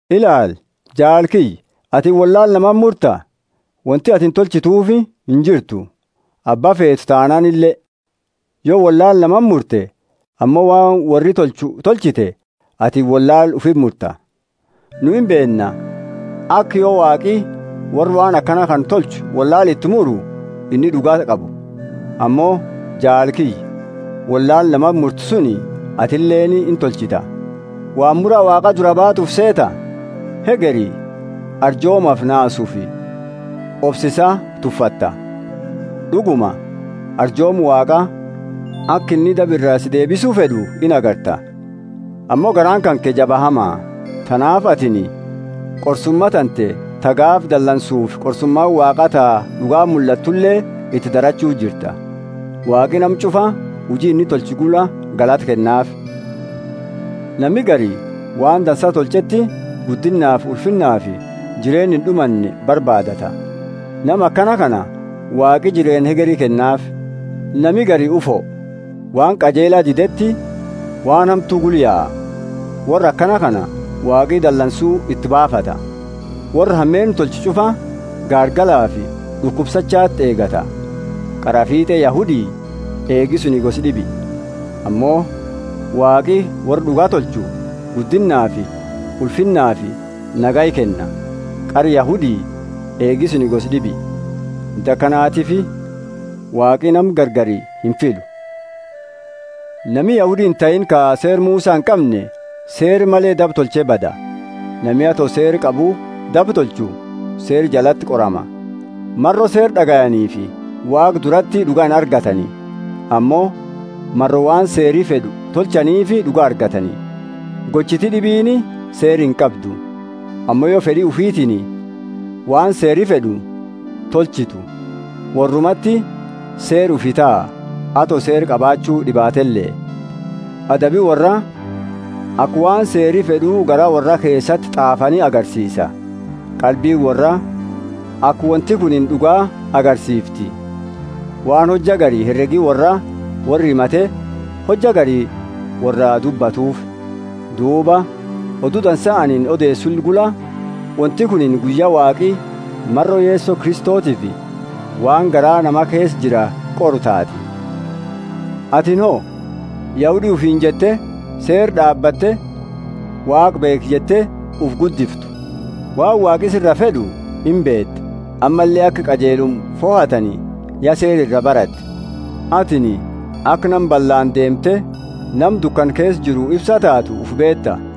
Ilaali, jaala kiyya, atini wollaala namati murta? Wonti atini tolchituufi injirtu, abba feetu taanaanile. Yo wollaala namati murte, ammo waan worri tolchu tolchite, atini wollaala ufiti murta. Nu imbeenna, aka yo Waaqi worra waan akana kana tolchu wollaala iti muru inni d'ugaa qabu. Ammo jaala kiyya, wollaala namati murtu suni atileeni intolchita. Waan mura Waaqa duraa baatu ufi seeta? Hegeri arjoomafi naasufi obsa isaa tuffatta. D'uguma arjooma Waaqa, aka inni daba ira si deebisu fed'u, inagarta. Ammo garaani kanke jaba hama. Tanaafi atini qorsuma tante, ta gaafa dalansufi qorsumaani Waaqa ta d'ugaa mullattule, iti darachu jirta. Waaqi nama ch'ufa huji inni tolche gula galata kennaafi. Nami gari waan dansa tolcheti guddinnaafi ulfinnafi jireenna ind'umanne barbaadata: nama akana kana Waaqi jireenna hegeri kennaafi. Nami gari ufo, waan qajeela dideti waan hamtu gula yaa: worra akana kana Waaqi dalansu iti baafata. Worra hameenna tolchu ch'ufa gaargalafi d'ukubsachati eegata, qaraa fiit'e Yahudi eegi suni gosa d'ibi. Ammo Waaqi worra d'uga tolchu guddinnaafi ulfinnafi nagaya kenna, qara Yahudi, eegi suni gosa d'ibi. Wonti akanatiifi Waaqi nama gargari imfiilu. Nami Yahudi intahiini ka Seera Musa inqamne seera male daba tolche bada. Nami ato Seera qabu daba tolchu Seera jalati qorama. Maro Seera d'agayaniifi Waaqa durati d'uga inargatani, ammo maro waan Seeri fed'u tolchaniifi d'uga argatani. Gochiti d'ibiini Seera inqabdu; ammo yo fed'i ufitiini waan Seeri fed'u tolchitu, worrumati seera ufi taha, ato Seera qabaachu dibatele. Adabi worraa aka waan seeri fed'u garaa worraa keesati t'aafani agarsiisa. Qalbiini worraa aka wonti kunini d'uga agarsiifti, waan hojja gari heregi worraa worra himate hojja gari worraa dubbatufi. Duuba Odu Dansa anini odeesu gula, wonti kunini guyya Waaqi, maro Yeso Kristotiifi, waan garaa nama keesa jiru qoru taati. Atini ho? Yahudi ufiini jette; Seera d'aabatte, Waaqa beekha jette ufi guddiftu; waan Waaqi siraa fed'u imbeeta, ammalle aka qajeeluma fohatani, ya Seera iraa baratte; atini aka nama ballaani deemte, nama dukana keesa jiru ifse taatu, ufi beeta.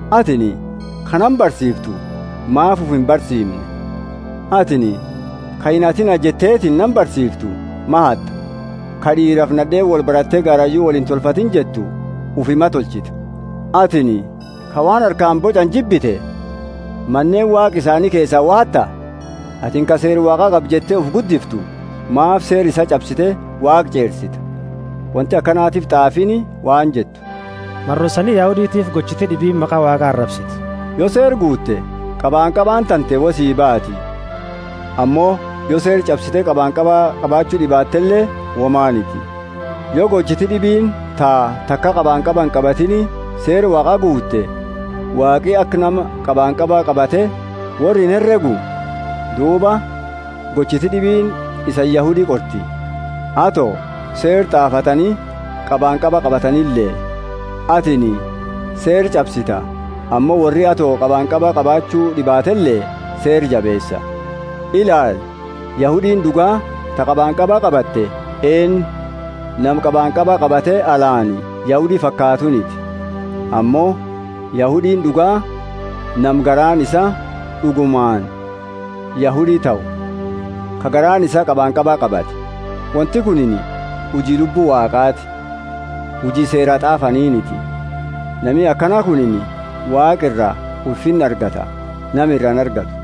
Atini ka nama barsiiftu maafi ufi imbarsiimne? Atini ka inhatina jetteetini nama barsiiftu ma hatta? Ka d'iirafi nad'eeni wolbarate garayu wolintolfati jettu ufi ma tolchita? Atini ka waan harkaani boch'ani jibbite, maneeni waaqa isaani keesa wo hatta? Atini ka Seera Waaqa qaba jette, ufi guddiftu, maafi Seera isa ch'absite Waaqa ch'eersita? Wonti akanatiifi t'aafiini waan jettu, Maro isani Yahuditiifi gochiti d'ibiini maqa Waaqa arabsiti. Yo Seera guute qabanqabaani tante wo sii baati; ammo yo Seera ch'absite qabanqaba qabachu d'ibaatele womaniti. Yo gochiti d'ibiini ta taka qabanqaba inqabatini Seera Waaqa guute, Waaqi aka nama qabanqaba qabate worra inheregu? Duuba gochiti d'ibiini isani Yahudi qorti. Ato Seera t'aafatani qabanqaba qabatanile, atini Seera ch'absita, ammo worri ato qabanqaba qabachu d'ibaatele Seera jabeesa. Ilaali Yahudiini d'ugaa ta qabanqaba qabate eennu; nama qabanqaba qabate alaani Yahudi fakaatuniti; ammo Yahudiini d'ugaa nama garaani isaa d'ugumaani Yahudi tahu, ka garaani isaa qabanqaba qabate, wonti kunini huji Lubbu Waaqati, huji Seera t'aafaniitiniti. Nami akana kunini Waaqa iraa ulfinna argata nama iraa inargatu.